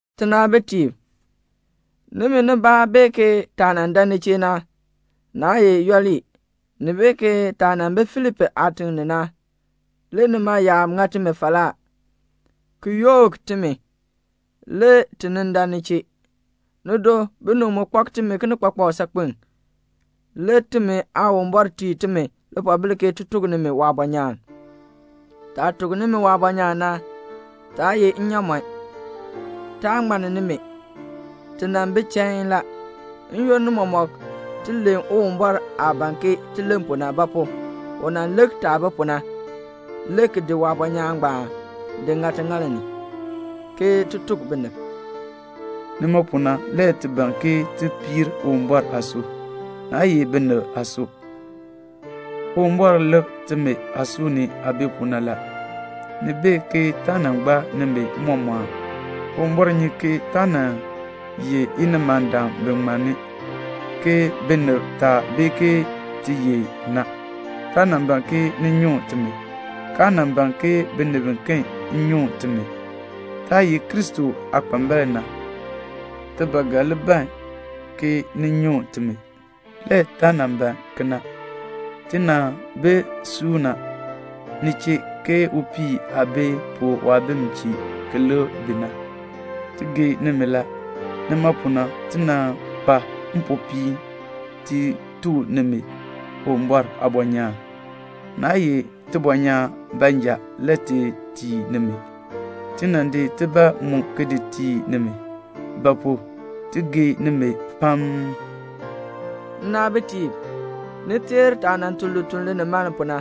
Tinaabitiib, nimi nibaa bee ke taah dan ni chee na, naa ye yooli. Ni bee ke taah nan bi Filipi aatiŋ ni na, le nima yaab ŋa timi falaa, ki yook timi, le ti nin dan ni chee. Nido, binib mu kpak timi kinikpakpak saakpen, le timi Aawumbɔr tii timi lipoobil ke ti tuk nimi waabɔnyaan. Taah tuk nimi waabɔnyaan na, taa ye nnyaamɔn. Taa ŋmann nimi. Ti nan bi chain la. N-yoonn mɔmɔk ti len Uwumbɔr aah ban ke ti len pu na; ba pu? u nan lik taah bi pu na, le ki di waabɔnyaan ngbaan di ŋa tiŋaal ni, ke ti tuk binib. Nima pu na le ti ban ke ti piir Uwumbɔr aasui, naa ye binib aasui. Uwumbɔr lik timi aasui ni aah bi pu na la. Ni bee ke taa nan gbaa nimi mmɔmɔɔn. Uwumbɔr nyi ke taa nan ye inimandam bi ŋmanni, ke binib taa bee ke ti ye na. Taa nan ban ke ni nyuŋ timi, kaa nan ban ke binib biken nyuŋ timi. Taah ye Kristo aakpambalb na, ti ba ga li ban ke ni nyuŋ timi. Le taa nan ban kena. Ti nan bi suuna ni chee ke upii aah bi pu waabim chee ki lik bi na. Ti gee nimi la. Nima pu na ti nan kpa mpopiin ti tuk nimi Uwumbɔr aabɔnyaan. Naa ye tibɔnyaan baanja le ti tii nimi, ti nan di tibaa mu ki tii nimi; ba pu? ti gee nimi pam. Nnaabitiib, ni teer taah tun lituln linimaln pu na.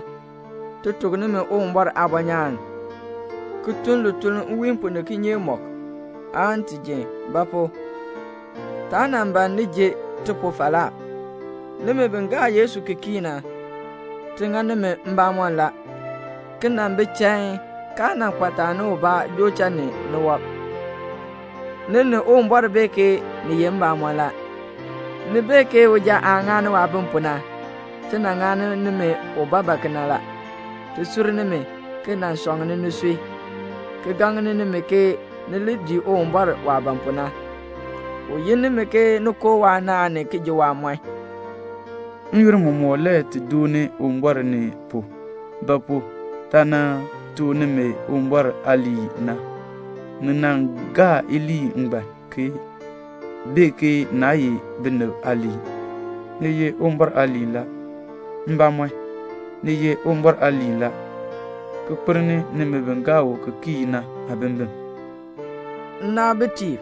Ti tuk nimi Uwumbɔr aabɔnyaan, ki tun lituln nwiin pu ni kinyeek mɔk, aan ti jin. Ba pu? taa nan ban ni ji ti pu falaa. Nimi bi gaa Yesu ki kii na, ti ŋa nimi mbamɔm la, ki nan bi chain, kaa nan kpa taani ubaa joo cha ni wɔb. Ni ni Uwumbɔr bee ke ni ye mbamɔn la. Ni bee ke uja aah ŋani waabim pu na, ti nan ŋani nimi ubaabaa kena la; ti sur nimi, ki nan sɔŋni nisui, ki gaŋni nimi ke ni li dii Uwumbɔr waah ban pu na. U yin nimi ke ni koo waanaan ni ki ji waamɔɔn. N-yoonn mɔmɔk le ti dooni Uwumbɔr ni pu; ba pu? taah nan tuk nimi Uwumbɔr aaliin na, ni nan gaa iliin ngbaan, ki bee ke naa ye binib aaliin, ni ye Uwumbɔr aaliin la. Mbamɔn, ni ye Uwumbɔr aaliin la, ki kpelni nimi bi gaa u ki kii na aabimbin. Nnaabitiib,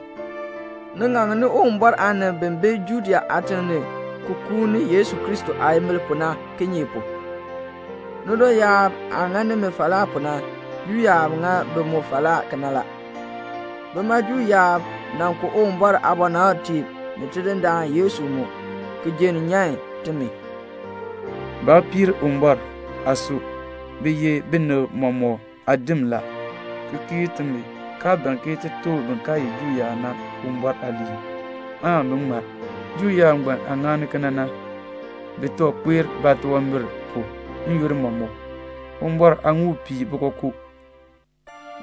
ni ŋakni Uwumbɔr aanib bi bi Judea aatim ni ki kuuni Yesu Kristo aayimbil pu na; kinye pu? nido yaab aah ŋa nimi falaa pu na, Juu yaab ŋa bi mu falaa kena la. Bima Juu yaab nan ku Uwumbɔr aabɔnabtiib ni Tidindaan Yesu mu, ki jenn nyan timi. Baa piir Uwumbɔr aasui. Bi ye binib mɔmɔk aadim la, ki kiir timi, kaa ban ke ti tuk bin kaa ye Juu yaab na Uwumbɔr aaliin, aan bi ŋmar. Juu yaab ngbaan aah ŋani kena na, bi tooh kpae baatunwambir pu n-yoonn mɔmɔk. Uwumbɔr aaŋuul pii bi kookoo.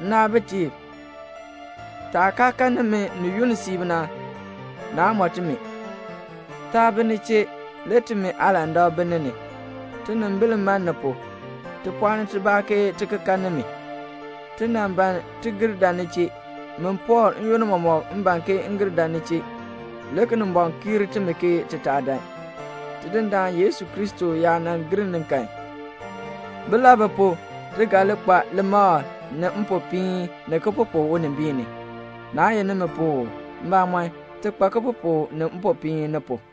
Nnaabitiib, taah kaa kan nimi ni yunn siib na, naa mɔ timi. Taa bi ni chee, le timi aalandak bi ni ni. Tinimbil man ni pu. Ti pɔɔni tibaa, ke ti ki kan nimi. Ti nan ban ti gir dan ni chee. Min Pɔɔl, n-yoonn mɔmɔk m ban ke m gir dan ni chee. Le Kinimbɔŋ kiir timi ke ti taa dan. Tidindaan Yesu Kristo yaa nan gir ni kan, bilabi pu ti ga li kpa limakl, ni mpopiin, ni kipupuk unimbiin ni? Naa ye nimi pu uu? Mbamɔn, ti kpa kipupuk ni mpopiin ni pu.